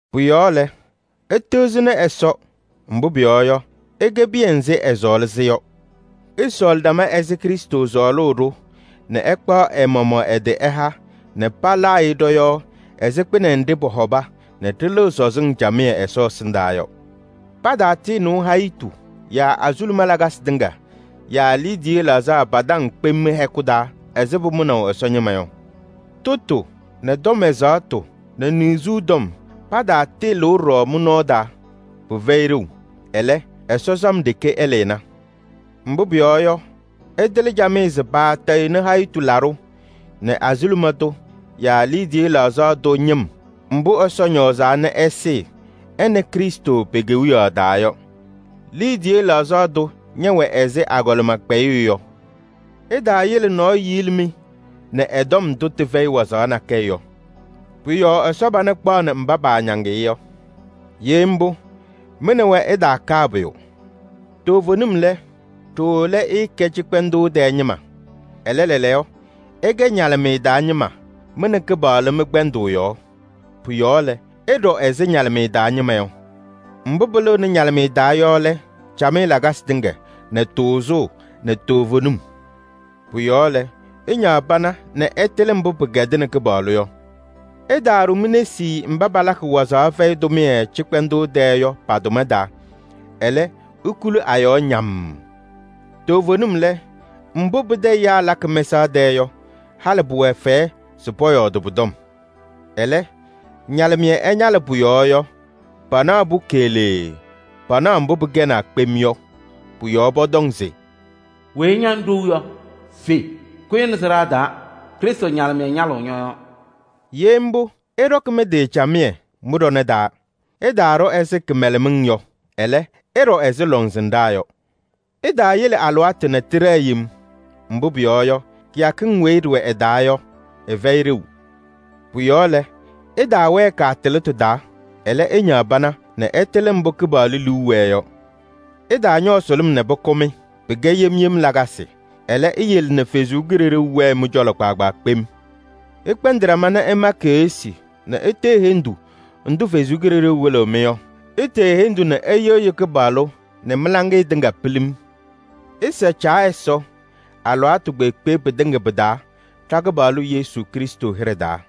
Pʋ-yɔɔ lɛ, ɩtɩɣzɩnɩ Ɛsɔ, mbʋ pʋyɔɔ yɔ, ɩkɛ piya nzɩ ɛsɔɔlɩ-sɩ yɔ. Ɩsɔɔlɩ ɖama ɛzɩ Krɩstʋ sɔɔlʋʋ-ɖʋ nɛ ɛkpaɣ ɛ-maɣmaɣ ɛ-tɩ ɛha nɛ palaa-ɩ ɖɔ-yɔɔ ɛzɩ kpɩnɛ nɖɩ pɔhɔba nɛ ɖɩlɩɣ sɔzɩŋ camɩyɛ Ɛsɔ ɛsɩndaa yɔ. Pataatɩɩnɩʋ hayitu yaa azuluma lakasɩ tɩŋa yaa liidiye laɣzaɣ pa-taŋ kpem mɩ-hɛkʋ taa ɛzɩ pʋmʋnaʋ Ɛsɔ ñɩma yɔ. Tʋtʋ nɛ tɔm ɛzaɣtʋ nɛ niɣzuu tɔm, pataatɩɩlɩʋ ɖɔɖɔ mɩ-nɔɔ taa: pɩfɛyɩ ɖeu. Ɛlɛ, Ɛsɔ sam ɖeke ɛlɩna. Mbʋ pʋyɔɔ yɔ, ɩtɩlɩ camɩyɛ se paatɩɩtayɩɣnɩ hayitu laɖʋ nɛ azuluma tʋ yaa liidiye laɣzaɣ tʋ ñɩm mbʋ Ɛsɔ ñɔɔzaa nɛ ɛsɩɩ ɛ nɛ Krɩstʋ pe-Kewiyaɣ taa yɔ. Liidiye laɣzaɣ tʋ ñɛwɛ ɛzɩ agɔlɩma kpɛyɩyʋ yɔ. Ɩtaayele nɔɔyʋ yili-mɩ nɛ ɛ-tɔm ndʋ tɩfɛyɩ wazaɣ nakɛyɛ yɔ: pʋ-yɔɔ Ɛsɔ pana kpaɣnɩ mba paañaŋ-ɩ yɔ. Ye mbʋ, mɩ nɛ wɛ ɩtaakaa pʋyʋ. Toovenim lɛ, ɖooo lɛ ɩɩkɛ cɩkpɛndʋʋ tɛɛ ñɩma. Ɛlɛ, lɛɛlɛɛyɔ ɩkɛ ñalɩmɩyɛ taa ñɩma mɩ nɛ Kɩpaɣlʋ mɩ-kpɛndʋʋ yɔɔ. Pʋ-yɔɔ lɛ, ɩɖɔ ɛzɩ ñalɩmɩyɛ taa ñɩma yɔ. Mbʋ pɩlɩɣnɩ ñalɩmɩyɛ taa yɔ lɛ: camɩyɛ lakasɩ tɩŋa nɛ tʋʋzʋʋ nɛ toovenim. Pʋ-yɔɔ lɛ, ɩñaɣ pana nɛ ɩtɩlɩ mbʋ pɩkɛdɩnɩ Kɩpaɣlʋ yɔ. Ɩtaaɖʋ mi-nesi mba palakɩ wazaɣ fɛyɩ tʋmɩyɛ cɩkpɛndʋʋ tɛɛ yɔ pa-tʋma taa. Ɛlɛ, ikuli a-yɔɔ ñammm. Toovenim lɛ, mbʋ pɩtɛ ɛyaa lakɩ mɛsaɣ tɛɛ yɔ, halɩ pʋwɛ fɛyɛ se pɔyɔɔdɩ pʋ-tɔm. Ɛlɛ, ñalɩmɩyɛ ɛñalɩ pʋ-yɔɔ yɔ, panaɣ-pʋ keɣlee, panaɣ mbʋ pɩkɛnaa kpem yɔ. Pʋ-yɔɔ pɔtɔŋ se: “Weyi ña ŋɖou yɔ, fe, kʋyɩ nɛ sɩɖaa taa, Krɩstʋ ñalɩmɩyɛ ñalɩɣ ñɔ-yɔɔ.” Ye mbʋ, ɩɖɔkɩ mɩ-tɩ camɩyɛ mɩ-ɖɔnɛ taa. Ɩtaaɖɔ ɛzɩ kɩmɛlɛmɩŋ yɔ, ɛlɛ, ɩɖɔ ɛzɩ lɔŋsɩnɖaa yɔ. Ɩtaayele alɩwaatʋ nɛ tɩɖɛɛ yem, mbʋ pʋyɔɔ yɔ, kɩyakɩŋ weyi ɖɩwɛ ɩ-taa yɔ, ɩfɛyɩ ɖeu. Pʋ-yɔɔ lɛ, ɩtaawɛɛ kaatɩlɩtʋ taa, ɛlɛ, ɩñaɣ pana nɛ ɩtɩlɩ mbʋ Kɩpaɣlʋ liu wɛɛ yɔ. Ɩtaañɔɔ sʋlʋm nɛ pʋkʋ-mɩ: pɩkɛ yem yem lakasɩ. Ɛlɛ, iyele nɛ Ɛsɔ Kalɩzaɣ wɛɛ mɩ-cɔlɔ kpaagbaa kpem. Ɩkpɛndɩ ɖama nɛ ɩma keɣsi nɛ itee hendu ndʋ Ɛsɔ Kalɩzaɣ wɩlɩɣ-mɩ yɔ. Itee hendu nɛ ɩyɩɣyɩ Kɩpaɣlʋ nɛ mɩ-laŋɩyɛ tɩŋa pilim. Ɩsa Caa Ɛsɔ alɩwaatʋ kpeekpe pɩtɩŋa pɩ-taa ɖa-Kɩpaɣlʋ Yesu Krɩstʋ hɩɖɛ taa.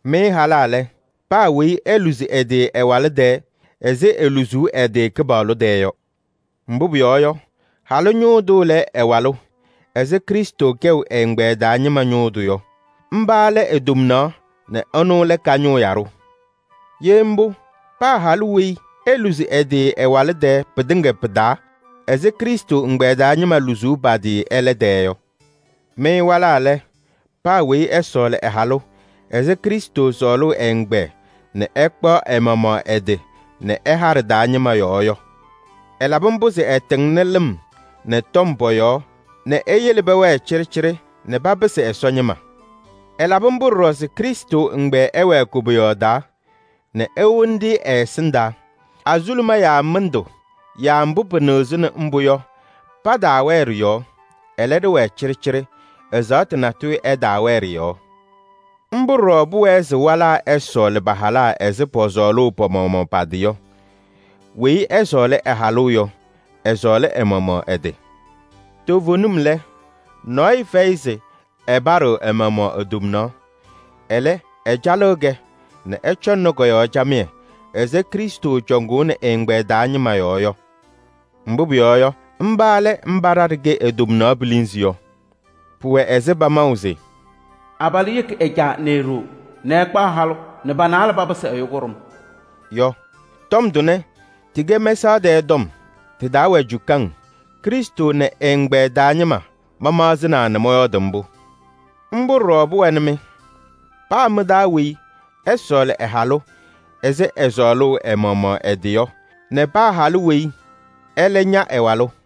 Mɩ halaa lɛ, paa weyi eluzi ɛ-tɩ ɛ-walʋ tɛɛ ɛzɩ eluzuu ɛ-tɩ Kɩpaɣlʋ tɛɛ yɔ. Mbʋ pʋyɔɔ yɔ, halʋ ñʋʋ tʋ lɛ ɛ-walʋ ɛzɩ Krɩstʋ kɛʋ ɛ-ɛgbɛyɛ taa ñɩma ñʋʋ tʋ yɔ. Mba lɛ e-tomnaɣ nɛ ɛnʋ lɛ ka-ñʋʋ yaɖʋ. Ye mbʋ, paa halʋ weyi eluzi ɛ-tɩ ɛ-walʋ tɛɛ pɩtɩŋa pɩ-taa ɛzɩ Krɩstʋ ɛgbɛyɛ taa ñɩma luzuu pa-tɩ ɛlɛ tɛɛ yɔ. Mɩ walaa lɛ, paa weyi ɛsɔɔlɩ ɛ-halʋ ɛzɩ Krɩstʋ sɔɔlʋʋ ɛ-ɛgbɛyɛ nɛ ɛkpaɣ ɛ-maɣmaɣ ɛ-tɩ nɛ ɛha ɖɩ-taa ñɩma yɔɔ yɔ. Ɛlabɩ mbʋ se ɛtɩŋnɩ lɩm nɛ tɔm pɔ-yɔɔ nɛ eyele pɛwɛɛ cɩɖɩcɩɖɩ nɛ papɩsɩ Ɛsɔ ñɩma. Ɛlabɩ mbʋ ɖɔɖɔ se ɖɩwɛɛ kɔcɔka nɛ ewoni-ɖɩ ɛ-ɛsɩndaa, azuluma yaa mɩndʋ yaa mbʋ pɩnɩɣzɩnɩ mbʋ yɔ, pataawɛɛ ɖɩ-yɔɔ, ɛlɛ, ɖɩwɛɛ cɩɖɩcɩɖɩ, ɛzaɣtʋ natʋyʋ ɛtaawɛɛ ɖɩ-yɔɔ. Mbʋ ɖɔɖɔ pʋwɛɛ se walaa ɛsɔɔlɩ pa-halaa ɛzɩ pɔsɔɔlʋʋ pa-maɣmaɣ pa-tɩ yɔ: weyi ɛsɔɔlɩ ɛ-halʋ yɔ, ɛsɔɔlɩ ɛ-maɣmaɣ ɛ-tɩ. Toovenim lɛ, nɔɔyʋ fɛyɩ se ɛpaɖɩɣ ɛ-maɣmaɣ e-tomnaɣ. Ɛlɛ, ɛcalɩɣ-kɛ nɛ ɛcɔŋnɩ kɔ-yɔɔ camɩyɛ ɛzɩ Krɩstʋ cɔŋʋʋnɩ ɛ-ɛgbɛyɛ taa ñɩma yɔɔ yɔ. Mbʋ pʋyɔɔ yɔ, mba lɛ mba ɖa ɖɩkɛ e-tomnaɣ pilinzi yɔ. Pʋwɛ ɛzɩ pamaʋ se: “Abalʋ yeki ɛ-caa nɛ e-ɖoo nɛ ɛkpaɣ halʋ nɛ pa-naalɛ papɩsɩ ɛyʋ kʋɖʋm” yɔ. Tɔm tʋnɛ, tɩkɛ mɛsaɣ tɛɛ tɔm, tɩ-taa wɛ cukaŋ. Krɩstʋ nɛ ɛ-ɛgbɛyɛ taa ñɩma mamaɣzɩnaa nɛ mɔyɔɔdɩ mbʋ. Mbʋ ɖɔɖɔ pʋwɛnɩ-mɩ: paa mɩ-taa weyi ɛsɔɔlɩ ɛ-halʋ ɛzɩ ɛsɔɔlʋʋ ɛ-maɣmaɣ ɛ-tɩ yɔ nɛ paa halʋ weyi ɛlɛ ña ɛ-walʋ.